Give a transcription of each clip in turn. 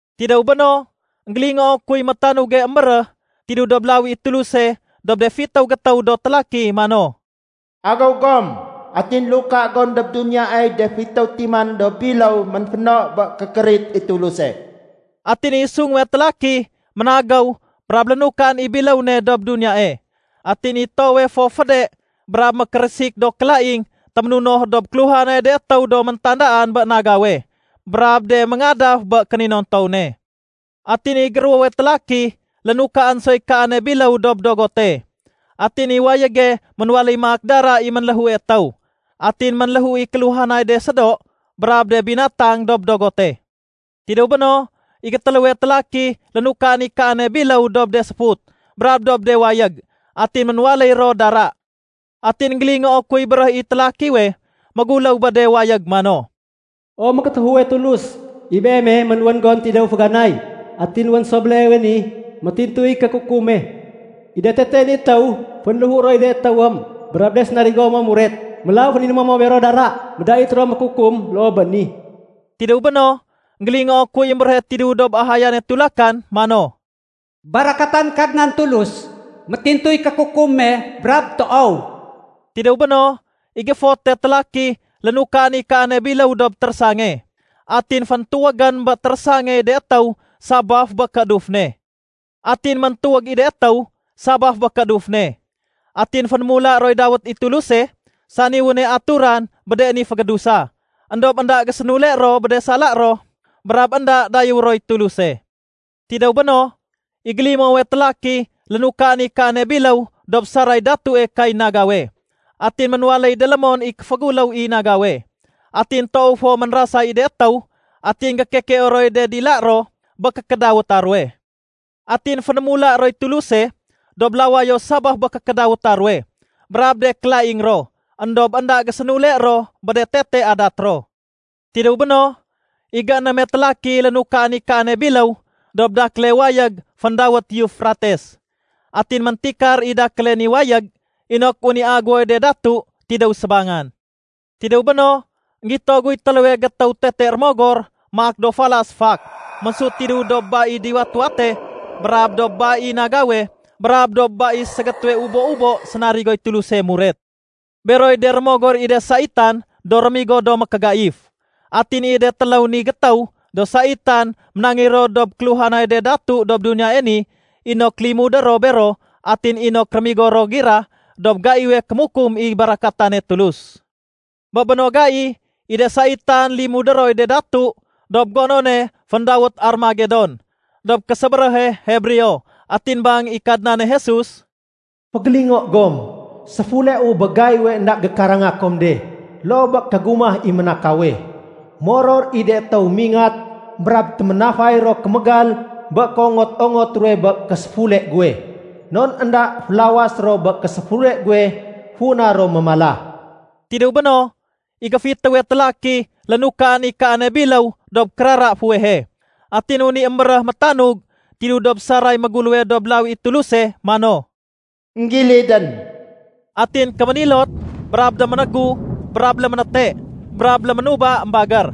Tidéw béno, énggélingoo kuy métanuge émbéréh tidéw dob lawi i Tuluse dob de fitéw gétéw do télaki mano, “Agéw gom atin luka gom dob duniyaey de fitéw timan do biléw ménféno bé kékérit i Tuluse.” Atin i sunguwe télaki ménagéw brab lénukaén i biléw ne dob duniyae. Atin i toowe fo féde brab mékérésik do kélaing téménunoh dob kéluhanay de étéw do méntandaan bé nagawe brab de méngadaf bé kéninontow ne. Atin i géruwowe télaki lénukaén soy kaane biléw dob dogote, atin i wayége ménwaléy maak dara i ménléhue étéw. Atin ménléhu i kéluhanay de sédo brab de binatang dob dogote. Tidéw béno, i gétéléwe télaki lénukaén i kaane biléw dob de séfut brab dob de wayég, atin ménwaléy ro dara. Atin énggélingoo kuy béréh i télakiwe méguléw bé de wayég mano, “O mékétéfuwe Tulus, i Beeme ménwén gon tidéw féganay atin wén so béleewe ni, métintuy kékukum me. I de tete ni étéw, fénléhu roy de étéwém brab de sénarigo mo muret. Mélaw féninémo mo bero dara. Médait ro mékukum loo bé ni.” Tidéw béno, énggélingoo kuy émbéréhe tidéw dob ahayane tulakan mano, “Barakatan Kadnan Tulus, métintuy kékukum me brab toow.” Tidéw béno, i géfote télaki lénukaén i kaane biléw dob térésange. Atin féntuwégén bé térésangey de étéw sabaf bé kééduf ne. Atin méntuwég i de étéw sabaf bé kééduf ne. Atin fénémula roy dawét i Tuluse, sani wéne aturan bé de ni fégédusa. Endob énda gésénule ro bé de sala ro brab énda dayéwé roy Tuluse. Tidéw béno, i gélimowe télaki lénukaén i kaane biléw dob saray datue kay nagawe. Atin ménwaléy délémon i kéféguléw i nagawe. Atin toow fo ménrasay i de étéw atin gékekeo roy de dila ro bé kékédawéta ruwe. Atin fénémula roy Tuluse dob lawayo sabaf bé kékédawéta ruwe brab de kélaing ro. Endob énda gésénule ro bé de tete adat ro. Tidéw béno, i géénéme télaki lénukaén i kaane biléw dob dakéle wayég féndawét Eufrates. Atin méntikar i dakéle ni wayég inok wén i aguwoy de datu tidéw sébangan. Tidéw béno, énggito guy téléwe gétéw tete rémogor maak do falas fak ménsut tidéw dob ba i diwat-wate brab dob ba i nagawe brab dob ba i ségétéwe ubo-ubo sénarigoy Tuluse muret. Beroy de rémogor i de saitan do rémigo do mékégaif. Atin i de téléw ni gétéw do saitan ménangéy ro dob kéluhanay de datu dob duniyae ni inok limudé ro bero atin inok rémigo ro gira dob gaiwe kémukum i barakatane Tulus. Bé béno gai, i de saitan limudé roy de datu dob gonone féndawét Armagedon dob késébéréhe Hebreo. Atin bang i Kadnane Jesus, “Fégélingo gom! Séfuleu bé gaiwe énda gékaranga kom de loo bé kégumah i ménakawe. Moror i de étéw mingat brab téménafay ro kémégal bé kéongot-ongot ruwe bé késéfule guwe. Non énda félawas ro bé késéfule guwe funa ro mémala.” Tidéw béno, i géfitéwe télaki lénukaén i kaane biléw dob kérara fuwehe. Atin wén i émbéréh métanug tidéw dob saray méguléwe dob lawi i Tuluse mano, “Enggilidén.” Atin kéménilot brab déménégu brab léménéte brab léménuba émbagér.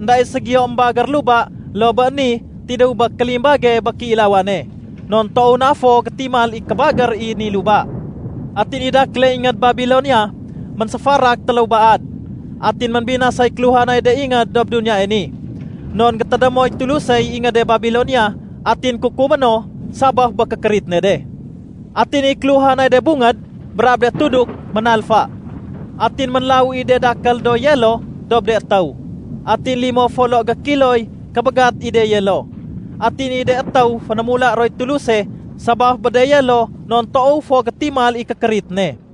Enda i ségiyo émbagér luba loo bé ni tidéw bé kélimbage bé kéilawane, non toow na fo gétimal i kébagér i ni luba. Atin i dakéle ingéd Babilonia ménséfarak téléw baad. Atin ménbinasay kéluhanay de ingéd dob duniyae ni. Non gétédémoy Tulusey ingéde Babilonia atin kukumé no sabaf bé kékérit ne de. Atin i kéluhanay de bungéd brab de tuduk ménalfa. Atin ménlawu i de dakél do yelo dob de étéw. Atin limo folo gékiloy kébégat i de yelo. Atin i de étéw fénémula roy Tuluse sabaf bé de yelo non toow fo gétimal i kékérit ne.